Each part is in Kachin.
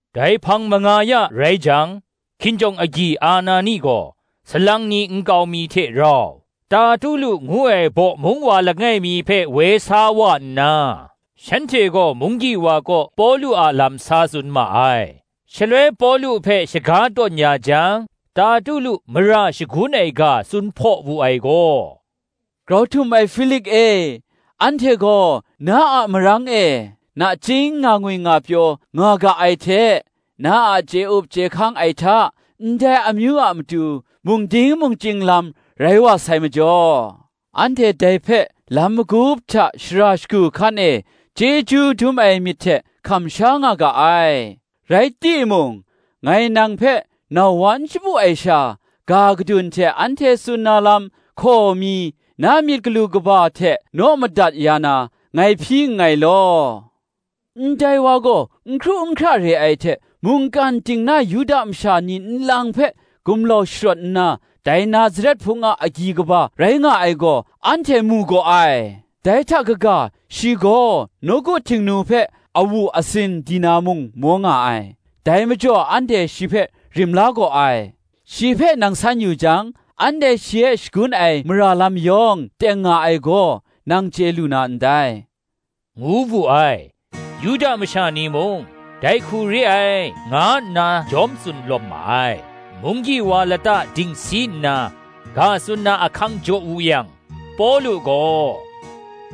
Dai hpang manga ya rai jang, hkinjawng agyi Anani gaw, salang ni nkau mi hte rau, Tertulu ngu ai bawmung wa langai mi hpe woi sa wa nna, shanhte gaw munggyi wa kaw Pawlu a lam sa tsun ma ai. Shaloi Pawlu hpe shaga tawn ya jang, Tertulu mara shagun ai ga tsun hpaw wu ai gaw, “Grau htum ai Hpilik e, anhte gaw na a marang e nachying nga ngwi nga pyaw nga ga ai hte, na a chye up chye hkang ai hta, ndai amyu a matu mung ding mung chying lam rai wa sai majaw, anhte dai hpe lam magup hta shara shagu hkan e, chyeju dum ai myit hte hkam sha nga ga ai. Rai timung, ngai nang hpe nau wa n shapu ai sha, ga gadun hte anhte tsun na lam hkaw mi, na myit galu kaba hte naw madat ya na, ngai hpyi nngai law. Ndai wa gaw n hkru n hkra re ai hte, mungkan ting na Yuda masha ni nlang hpe gumlau sharawt nna, dai Nazaret hpung a agyi kaba rai nga ai gaw, anhte mu gaw ai: dai hta kaga, shi gaw nawku Htingnu hpe awu asin di na mung maw nga ai: dai majaw anhte shi hpe rim la gaw ai: shi hpe nang san yu jang, anhte shi e shagun ai mara lam yawng teng nga ai gaw, nang chye lu na ndai,” ngu wu ai. Yuda masha ni mung, “dai hku re ai,” nga nna jawm tsun lawm ma ai. Munggyi wa lata dingsi nna, ga tsun na ahkang jaw wu yang, Pawlu gaw,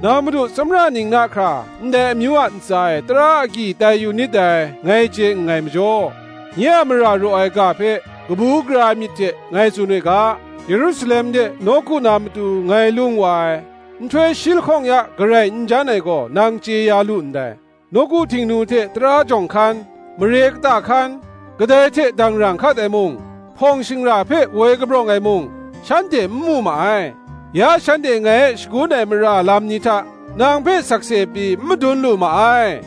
“Nang madu tsawmra ning na hkra ndai amyu a ntsa e tara agyi tai yu nit dai, ngai chye nngai majaw, nye a mara raw ai ga hpe kabu gara ai myit hte ngai tsun we ga: Yerusalem de nawku na matu ngai lung wa ai, nhtoi shi lahkawng ya garai n jan ai gaw, nang chye ya lu ndai. Nawku Htingnu hte tara jawng hkan, mare kata hkan, kadai hte dangrang hkat ai mung, hpawng shingra hpe woi kabrawng ai mung, shanhte n mu ma ai. Ya shanhte ngai e shagun ai mara lam ni hta, nang hpe sakse pyi n madun lu ma ai.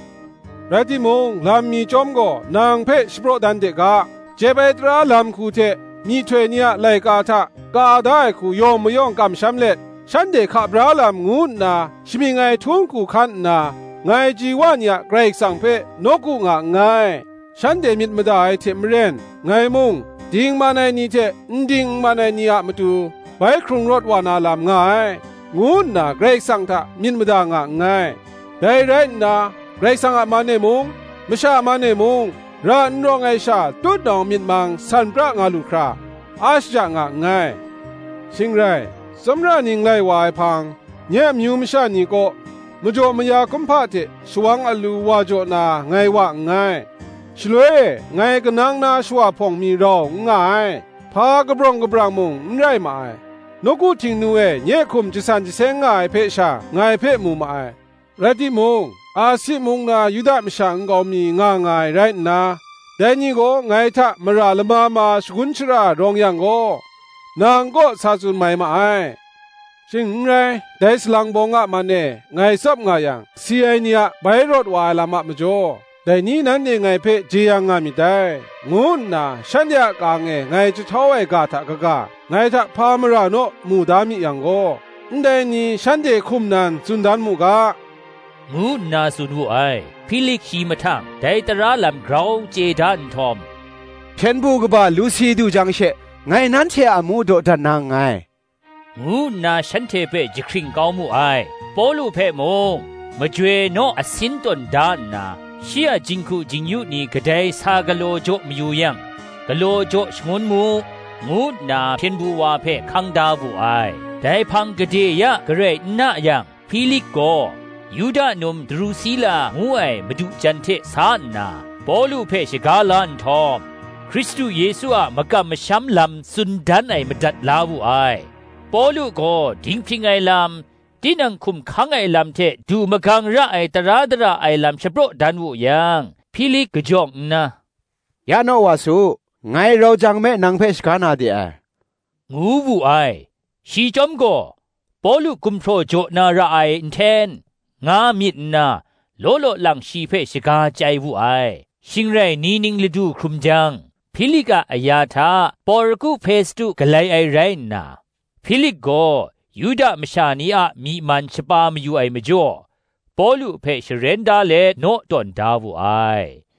Rai timung, lam mi chyawm gaw nang hpe shapraw dan de ga; Jep ai tara lam shagu hte myihtoi ni a laika hta ka da ai hku yawng mayawng kamsham let, shanhte hka bra Lam ngu nna shamying ai htung hku hkan nna, ngai ji wa ni a Karai Kasang hpe nawku nga nngai: shanhte myit mada ai hte maren, ngai mung, dingman ai ni hte n ding n man ai ni a matu, bai hkrung rawt wa na lam nga ai, ngu nna Karai Kasang hta myit mada nga nngai. Dai rai nna, Karai Kasang a man e mung, masha a man e mung, ra n rawng ai sha tutnawng myit mang san pra nga lu hkra, a shaja nga nngai. Shing rai, tsawmra ning lai wa ai hpang, nye amyu masha ni kaw, majaw maya kumhpa hte shawang alu wa jaw na ngai wa nngai: shaloi e, ngai kanang na shawa hpawng mi rau n nga ai, hpa kabring kabrawng mung n rai ma ai; nawku Htingnu e nye hkum jasan jaseng nga ai hpe sha, ngai hpe mu ma ai; rai timung, Asi mung na Yuda masha nkau mi nga nga ai rai nna, dai ni gaw, ngai hta mara lama ma shagun shara rawng yang gaw, nang kaw sa tsun mai ma ai. Shing n rai, dai salang bawng a man e ngai tsap nga yang, Si ai ni a bai hkrung rawt wa ai lam a majaw, dai ni nanhte ngai hpe jeyang nga myit dai, ngu nna, shanhte a ka-ang e ngai jahtau ai ga hta kaga, ngai hta hpa mara naw mu da mi yang gaw, ndai ni shanhte hkum nan tsun dan mu ga,” ngu nna tsun wu ai. Hpilik shi mahtang, dai tara lam grau chye da nhtawm, “hpyen du kaba Lusi du jang she, ngai nanhte a amu dawdan na nngai,” ngu nna shanhte hpe jahkring kau mu ai. Pawlu hpe mung majoi naw a sin tawn da nna, shi a jinghku jing-yu ni kadai sa galaw jaw mayu yang, galaw jaw shangun mu, ngu nna hpyen du wa hpe hkang da wu ai. Dai hpang gade ya garai n na yang, Hpilik gaw, Yuda num Drusila ngu ai madu jan hte sa nna, Pawlu hpe shaga la nhtawm, Hkristu Yesu a makam masham lam tsun dan ai madat la wu ai. Pawlu gaw dinghpring ai lam, tinang hkum hkang ai lam hte du magang ra ai tara dara ai lam shapraw dan wu yang, Hpilik kajawng nna, “Ya naw wa su, ngai rau jang me nang hpe shaga na de ai,” ngu wu ai. Shi chyawm gaw, Pawlu gumhpraw jaw na ra ai nhten, nga myit nna, law law lang shi hpe shaga chyai wu ai. Shing rai ni ning ladu hkrum jang, Hpilik a aya hta Porku Hpestu galai ai rai nna, Hpilik gaw Yuda masha ni a myi man shapa mayu ai majaw, Pawlu hpe sharen da let naw tawn da wu ai.